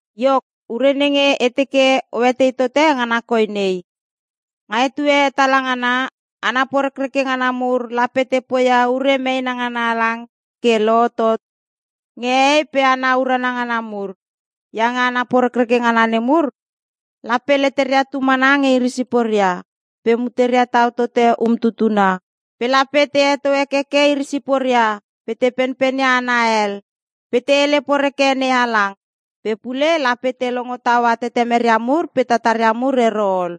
Iok, ure nenge e teke oetei tote ngana koi nei: Nga etue hetala ngana, hana porekreke ngana mur lape te poia ure meena ngana halang ke lohotot nge hehei pe hana urana ngana mur. Iange hana porekreke ngana nemur lape leteria tu mana nge iri siporia, pe muteria tau tote umtutuna, pe lape te heto hekeke iri siporia, pe te penpenia hana hel, pe te hele poreke NeHalang. Pe pule lape te longo taua tetemeria mur pe tataria mur ero ol.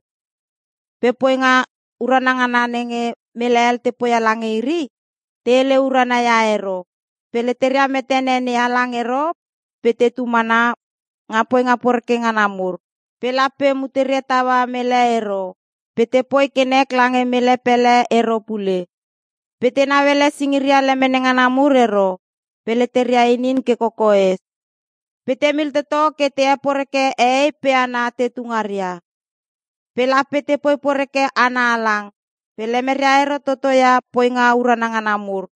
Pe poinga urana ngana nenge mele hel te poia lange iri, te hele urana ia ero. Pe leteria metene NeHalang ero pe tetu mana nga poinga porekreke ngana mur. Pe lape muteria taua mele ero, pe tepoi ke nek lange mele pele ero pule. Pe tenau ele singiria lemene ngana mur ero, pe leteria inin ke kokoes. Pe temil toto ke te heporeke hehei pe hana tetu ngaria, pe lape tepoi poreke hana halang, pe lemeria ero totoia poinga urana ngana mur.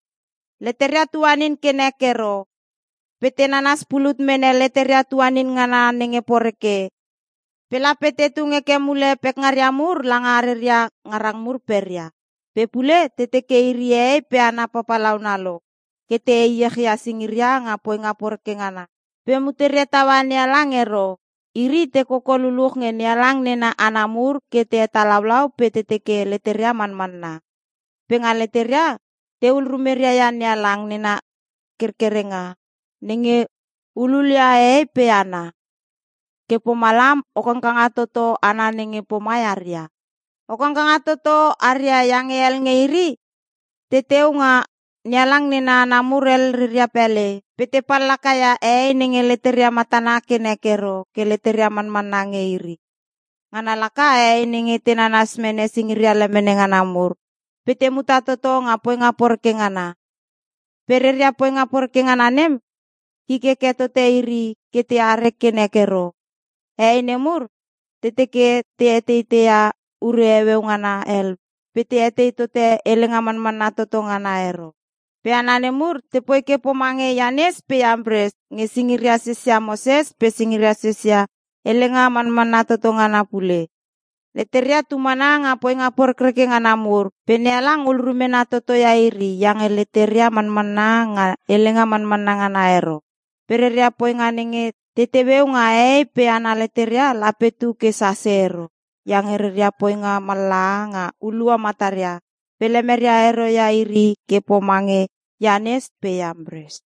Leteria tuanin ke nek ero, pe te nanas pulut mene leteria tuanin ngana nenge poreke, pe lape te tung heke mule pekngaria mur langa reria ngarang mur peria. Pe pule te teke iri hehei pe hana papalauna lo ke te heiech ia singiria nga poinga poreke ngana pe muteria taua NeHalang ero. Iri te koko luluch nge NeHalang nena hana mur ke te hetalaulau pe te teke leteria manmanna. Pe nga leteria, tehul rumeria ia NeHalang nena kerkerenga nenge hululia hehei pe hana. Ke pomalam o kangkanga toto hana nenge pomai aria. O kangkanga toto aria iange hel nge iri teteu nga NeHalang nena hana mur hel reria pele pe te pallakaia hehei nenge leteria matana ke nek ero ke leteria manmanna nge iri. Ngana laka hehei nenge te nanas mene singiria lemene ngana mur pe te muta toto nga poinga poreke ngana. Pe reria poinga poreke ngana nem kik heke tote iri ke teare ke nek ero. Hehei nemur te teke te eteiteia ure heueu ngana hel pe te etei tote helenga manmanna toto ngana ero. Pe hana nemur tepoi ke pomange Ianes pe Iampres nge singiria sesia Moses pe singiria sesia helenga manmanna toto ngana pule. Leteria tumana nga poinga porekreke ngana mur pe NeHalang hul rumena totoia iri iange leteria manmanna nga helenga manmanna ngana ero. Pe reria poinga nenge te teueu nga hehei pe hana leteria lape tuke sase ero, iange reria poinga mallaha nga hulua mataria pe lemeria ero ia iri ke pomange Ianes pe Iampres.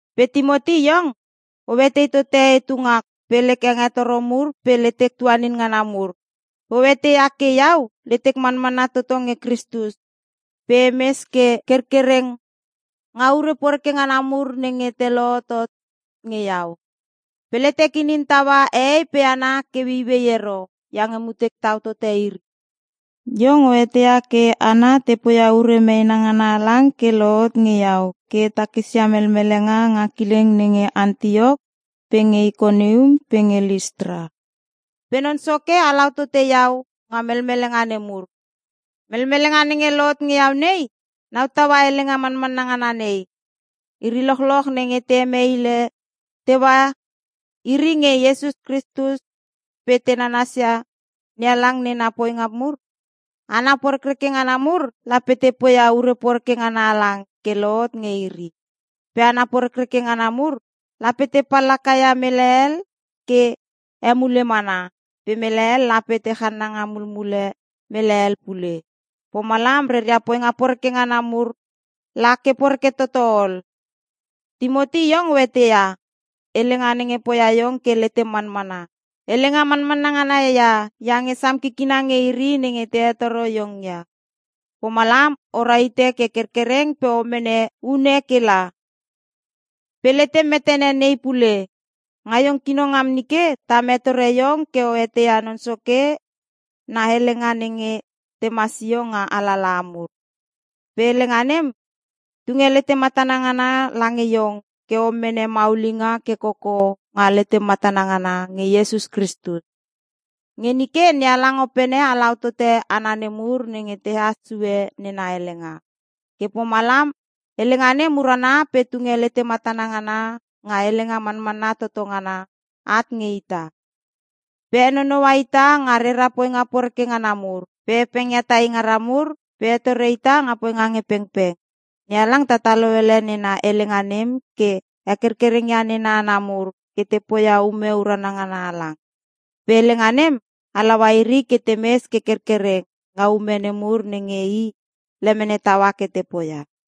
Pe Timoti iong, o etei tote etu ngak pe lek hengetoro mur pe letek tuanin ngana mur. Pe o eteia ke iau letek manmanna toto nge Kristus pe emes ke kerkereng nga ure poreke ngana mur nenge te lohotot nge iau. Pe letek inin taua hehei pe hana ke ueiuei ero iange mutek tau tote iri. Iong o eteia ke hana te poia ure meena ngana halang ke lohot nge iau ke e takisia melmelenga nga kileng nenge Antiok pe nge Ikonium pe nge Listra. Pe Non Soke halau tote iau nga melmelenga nemur. Melmelenga nenge lohot nge iau nei nau taua helenga manmanna ngana nei: Iri lochloch nenge te hemeile teua iri nge Iesus Kristus pe te nanasia NeHalang nena poinga mur, hana porekreke ngana mur lape te poia ure poreke ngana halang ke lohot nge iri. Pe hana porekreke ngana mur lape te pallaka ia mele hel ke emule mana, pe mele hel lape te channanga mulmule mele hel pule. Pomalam reria poinga poreke ngana mur la ke poreke tototo ol. Timoti iong o eteia, helenga nenge poia iong ke letem manmanna, i helenga manmanna ngana ia iange sam kikina nge iri nenge te hetoro iong ia. Pomalam o rahite ke kerkereng pe o mene une kela. Pe letem metene nei pule: Nga iong kino ngam nike tam hetore iong ke o eteia Non Soke na Helenga nenge tema sio nga alalaha mur. Pe Helenga nem tunge letematana ngana lange iong ke o mene maulinga ke koko nga letem manmanna ngana nge Iesus Kristus. Nge nike NeHalang Opene halau tote hana nemur nenge tehas sue nena Helenga. Ke pomalam Helenga nem urana pe tunge letematana ngana nga helenga manmanna toto ngana at nge ita. Pe henonoua ita nga rera poinga poreke ngana mur, pe hepengia tai ngara mur, pe hetore ita nga poinga nge pengpeng. NeHalang tatalo ele nena helenga nem ke hekerkereng ia nena hana mur ke te poia ume urana ngana halang. Pe helenga nem halaua iri ke temes ke kerkereng nga ume nemur nenge I lemene taua ke te poia.